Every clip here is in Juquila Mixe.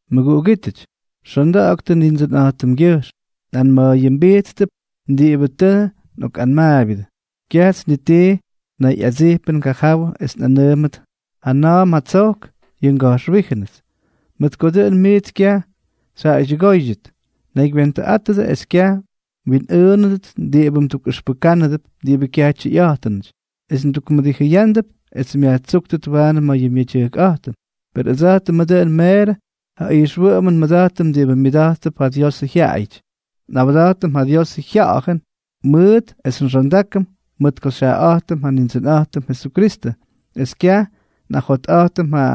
Mʉguꞌugítʉty, xonda̱ꞌa̱ktʉ Nindsʉnꞌa̱jtʉmgyʉjxm. Nꞌanma̱a̱yʉmbijttʉp diꞌibʉ tʉ nꞌokꞌanmaabyʉdʉ. Kyajts ni ti nayꞌadsijpʉn ngajawʉ es nꞌanʉʉmʉt jana̱a̱m jatsojk yʉ nga̱jxwíjʉnʉts, mʉt ko dʉꞌʉn miits kyaj xyjaꞌaydyʉgóydyʉt. Naygywentʉꞌátʉdʉ es kyaj mwinꞌʉʉnʉdʉt diꞌibʉ mdukꞌʉxpʉkánʉdʉp diꞌibʉ kyaj tyʉyꞌa̱jtʉnʉty, es mdukmʉdijʉyánʉdʉp es myajtsúktʉt waanʉ ma̱ yʉ myedyʉjkꞌa̱jtʉn. Per ʉdsa̱jtʉmʉ dʉꞌʉn meerʉ ja ijxwʉꞌʉmʉn nmʉda̱jtʉm diꞌibʉ myʉda̱jttʉp ja Diosʉ jyaꞌayʉty, nꞌawda̱jtʉm ja Diosʉ Jya̱ꞌa̱jʉn mʉʉt es nxondákʉm mʉt ko xyjaꞌaꞌa̱jtʉm ja Nindsʉnꞌa̱jtʉm Jesukristʉ, es kyaj nꞌajotꞌa̱jtʉm ja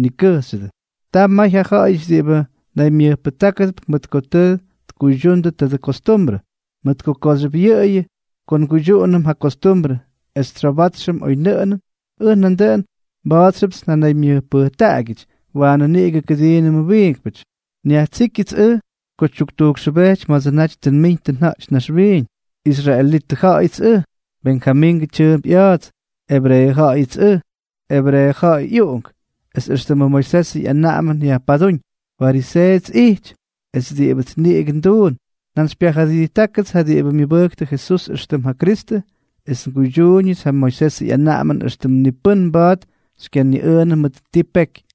nikʉjxyʉdʉ. Ta may ja ja̱ꞌa̱yʉty diꞌibʉ naymyʉjpʉjtákʉdʉp mʉt ko tʉ tkuydyuñʉ tadʉ kostumbrʉ. Mʉt kooxyʉp yʉꞌʉyʉ ko nguydyuꞌunʉm ja kostumbrʉ es tsyobátxyʉp oynʉꞌʉnʉn, ʉj nandʉꞌʉn mba̱a̱txyʉpts nnaymyʉjpʉjtaꞌagyʉty waanʉ niꞌigʉ kʉdiinʉmʉ wiinkpʉty. Nyajtsijkyʉts ʉj ko tyuktujkxʉbejty ma̱dsʉ naty tʉ nmiñ tʉ nja̱ꞌty naxwiiñ, israelitʉ ja̱ꞌa̱yʉts ʉj, Benjamingʉ tyʉʉmp ꞌya̱a̱ts, ebreeʉ ja̱ꞌa̱yʉts ʉj, ebreeʉ ja̱ꞌa̱y ꞌyꞌuꞌunk, es éxtʉmʉ Moisesʉ ꞌyanaꞌamʉn yajpadúñ, fariseeʉts ꞌyijty; es diꞌibʉts niꞌigʉ nduun, njantsypyajʉdijttákʉts ja diꞌibʉ myʉbʉjktʉ Jesús éxtʉm ja Kristʉ, es nguydyuuñʉts ja Moisesʉ ꞌyanaꞌamʉn éxtʉmts ni pʉ́n mba̱a̱t xykyaniꞌʉʉnʉ mʉt ti peky.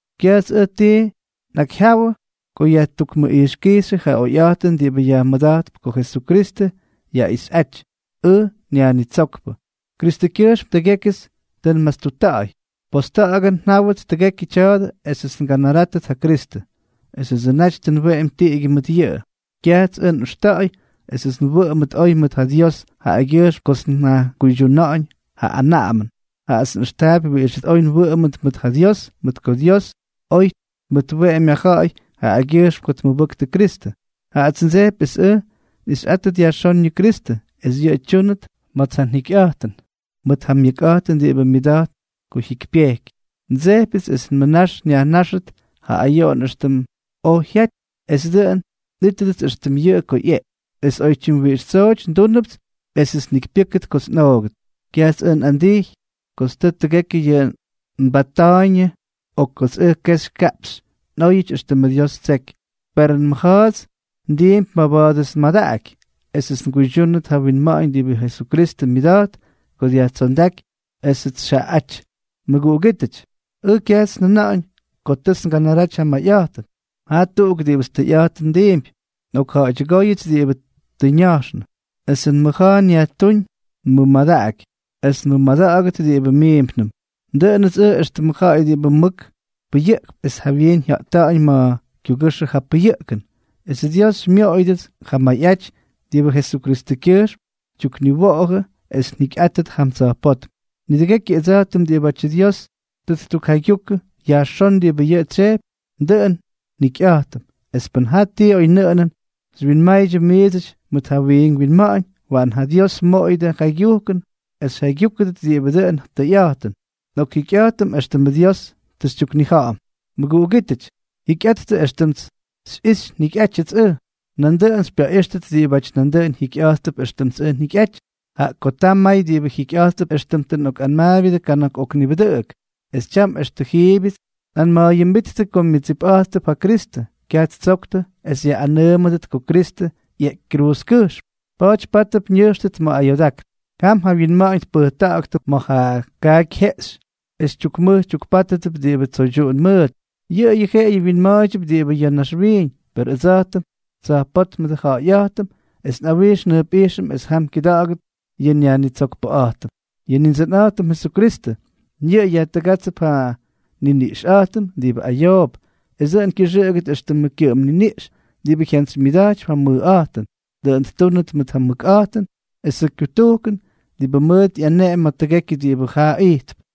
kyajts ʉj ti nnekyjyawʉ ko yajtukmʉꞌijxkijxyʉ ja oyꞌa̱jtʉn diꞌibʉ yajmʉda̱jtp ko Jesukristʉ yaꞌixꞌáty, ʉj nYajnitsókpʉ. Kristʉkyʉjxm tʉgékyʉts tʉ nmastuꞌutta̱ꞌa̱y. Posta̱ꞌa̱gʉn njáwʉts tʉgekyʉ tya̱dʉ esʉts nganarátʉt ja Kristʉ, esʉdsʉ naty tʉ nweꞌemy tiꞌigyʉ mʉt yʉꞌʉ. Kyajts ʉj nꞌʉxta̱ꞌa̱y esʉts nwʉꞌʉmʉt oy mʉt ja Dios jaꞌagyʉjxm kots njakuydyuna̱ꞌa̱ñ ja anaꞌamʉn, jaꞌats nꞌʉxtaapy wiꞌixʉts oy nwʉꞌʉmʉt mʉt ja Dios mʉt ko Dios oy tmʉtweꞌemy ja ja̱ꞌa̱y jaꞌagyʉjxm ko tmʉbʉktʉ Kristʉ. Jaꞌats ndsejpy es ʉj nꞌixyꞌátʉt yajxón yʉ Jesukristʉ, es yʉꞌʉ tyúnʉt ma̱ts ja njikyꞌa̱jtʉn mʉt ja myʉkꞌa̱jtʉn diꞌibʉ myʉda̱jt ko jyikypyejky. Ndsejpyʉts es nmʉnax nyajnáxʉt ja ayoꞌon éxtʉm oj jyaty, es dʉꞌʉn nꞌítʉdʉts éxtʉm yʉꞌʉ ko ꞌyeꞌky, es oy tyimwiꞌix tsooty ndúnʉpts esʉts njikypyʉ́kʉt kots nꞌoogʉt. Kyajts ʉj nꞌandijy kots tʉ tʉgekyʉ yʉꞌʉ nbatta̱a̱yñʉ o kots ʉj kexy kaꞌpxy nꞌóyʉty éxtʉmʉ Dios ttseky, per nmʉja̱a̱ts ndiimpy maba̱a̱dʉts nmadaꞌaky esʉts nguydyúnʉt ja winma̱ꞌa̱ñ diꞌibʉ Jesukristʉ myʉda̱jt ko dyajtsondáky esʉts xyjaꞌaꞌáty. Mʉguꞌugítʉty, ʉj kyajts njʉna̱ꞌa̱ñ ko tʉts nganaraty ja mayꞌaty. Ta tuꞌuk diꞌibʉts tʉyꞌa̱jtʉn ndiimpy. Nꞌokja̱ꞌa̱ydyʉgóyʉts diꞌibʉ tʉ ña̱jxnʉ, esʉ nmʉja̱a̱ nyajtúñ maba̱a̱dʉts nmʉdaꞌaky es nmʉmʉda̱ꞌa̱gʉdʉt diꞌibʉ miimpnʉm. Dʉꞌʉnʉts ʉj éxtʉmʉ ja̱ꞌa̱y diꞌibʉ mʉk pʉyʉꞌkp es jawyiin jya̱ꞌta̱ꞌa̱ñ ma̱ kyugʉxʉ ja pʉyʉꞌkn, esʉ Dios xymyoꞌoyʉdʉts ja mayꞌaty diꞌibʉ Jesukristʉkyʉjxm xytyukniwowʉ esʉts njikyꞌátʉt jam tsa̱jpótm. Nidʉgekyʉ ʉdsa̱jtʉm diꞌibátyʉ Dios tʉ ttukjaygyukʉ yajxón diꞌibʉ yʉꞌʉ tsyejpy, dʉꞌʉn njikyꞌa̱jtʉm. Es pʉn jaa ti oynʉꞌʉnʉn xywyinmaydyʉ miidsʉty mʉt ja wiink winma̱ꞌa̱ñ, waꞌan ja Dios mmoꞌoyʉdʉ jaygyujkʉn es xyjaygyúkʉdʉt diꞌibʉ dʉꞌʉn tʉyꞌa̱jtʉn. Nꞌokjikyꞌa̱jtʉm éxtʉmʉ Dios tʉ xytyuknija̱ꞌa̱m. Mʉguꞌugítʉty, jikyꞌattʉ éxtʉmts xyꞌixy njikyꞌátyʉts ʉj. Nandʉꞌʉn xypyaꞌíxtʉt diꞌibáty nandʉꞌʉn jikyꞌa̱jttʉp éxtʉmts ʉj njikyꞌaty. Jaꞌa ko ta may diꞌibʉ jikyꞌa̱jttʉp éxtʉm tʉ nꞌokꞌanmaabyʉdʉ kana̱k ok nibʉdʉꞌʉk, es tyam extʉ jiibyʉts nꞌanma̱a̱yʉmbíttʉ ko myʉdsipꞌa̱jttʉp ja Kristʉ, kyaj ttsoktʉ es yaꞌꞌanʉʉmʉdʉt ko Kristʉ ꞌyeꞌky kruuzkʉjxm, pa̱a̱ty pátʉp ñʉjxʉt ma̱ ayoodákn. Jam ja wyinma̱ꞌa̱ñ tpʉjta̱ꞌa̱ktʉ ma̱ ja kaaky jeꞌxy es tyukmʉj tyukpátʉdʉp diꞌibʉ tsoydyuꞌun mʉʉt. Yʉꞌʉyʉ jeꞌeyʉ wyinma̱a̱ydyʉp diꞌibʉ ya̱ naxwiiñ. Per ʉdsa̱jtʉm, tsa̱jpótmʉdʉ ja̱ꞌa̱yꞌa̱jtʉm, es nꞌawijx njʉjpꞌijxʉm es jam kyʉda̱ꞌa̱gʉt yʉ nYajnitsokpʉꞌa̱jtʉm, yʉ Nindsʉnꞌa̱jtʉm Jesukristʉ. Yʉꞌʉ yajtʉgátsʉp ja nniniꞌxꞌa̱jtʉm diꞌibʉ ayoop, es dʉꞌʉn kyʉxʉꞌʉgʉt éxtʉmʉ kyʉꞌʉm niniꞌx diꞌibʉ jyantsymyʉda̱jtypy ja mʉjꞌa̱jtʉn; dʉꞌʉn ttúnʉt mʉt ja myʉkꞌa̱jtʉn esʉ kyutujkʉn diꞌibʉ mʉʉt ꞌyaneꞌemy ma̱ tʉgekyʉ diꞌibʉ jaa ijtp.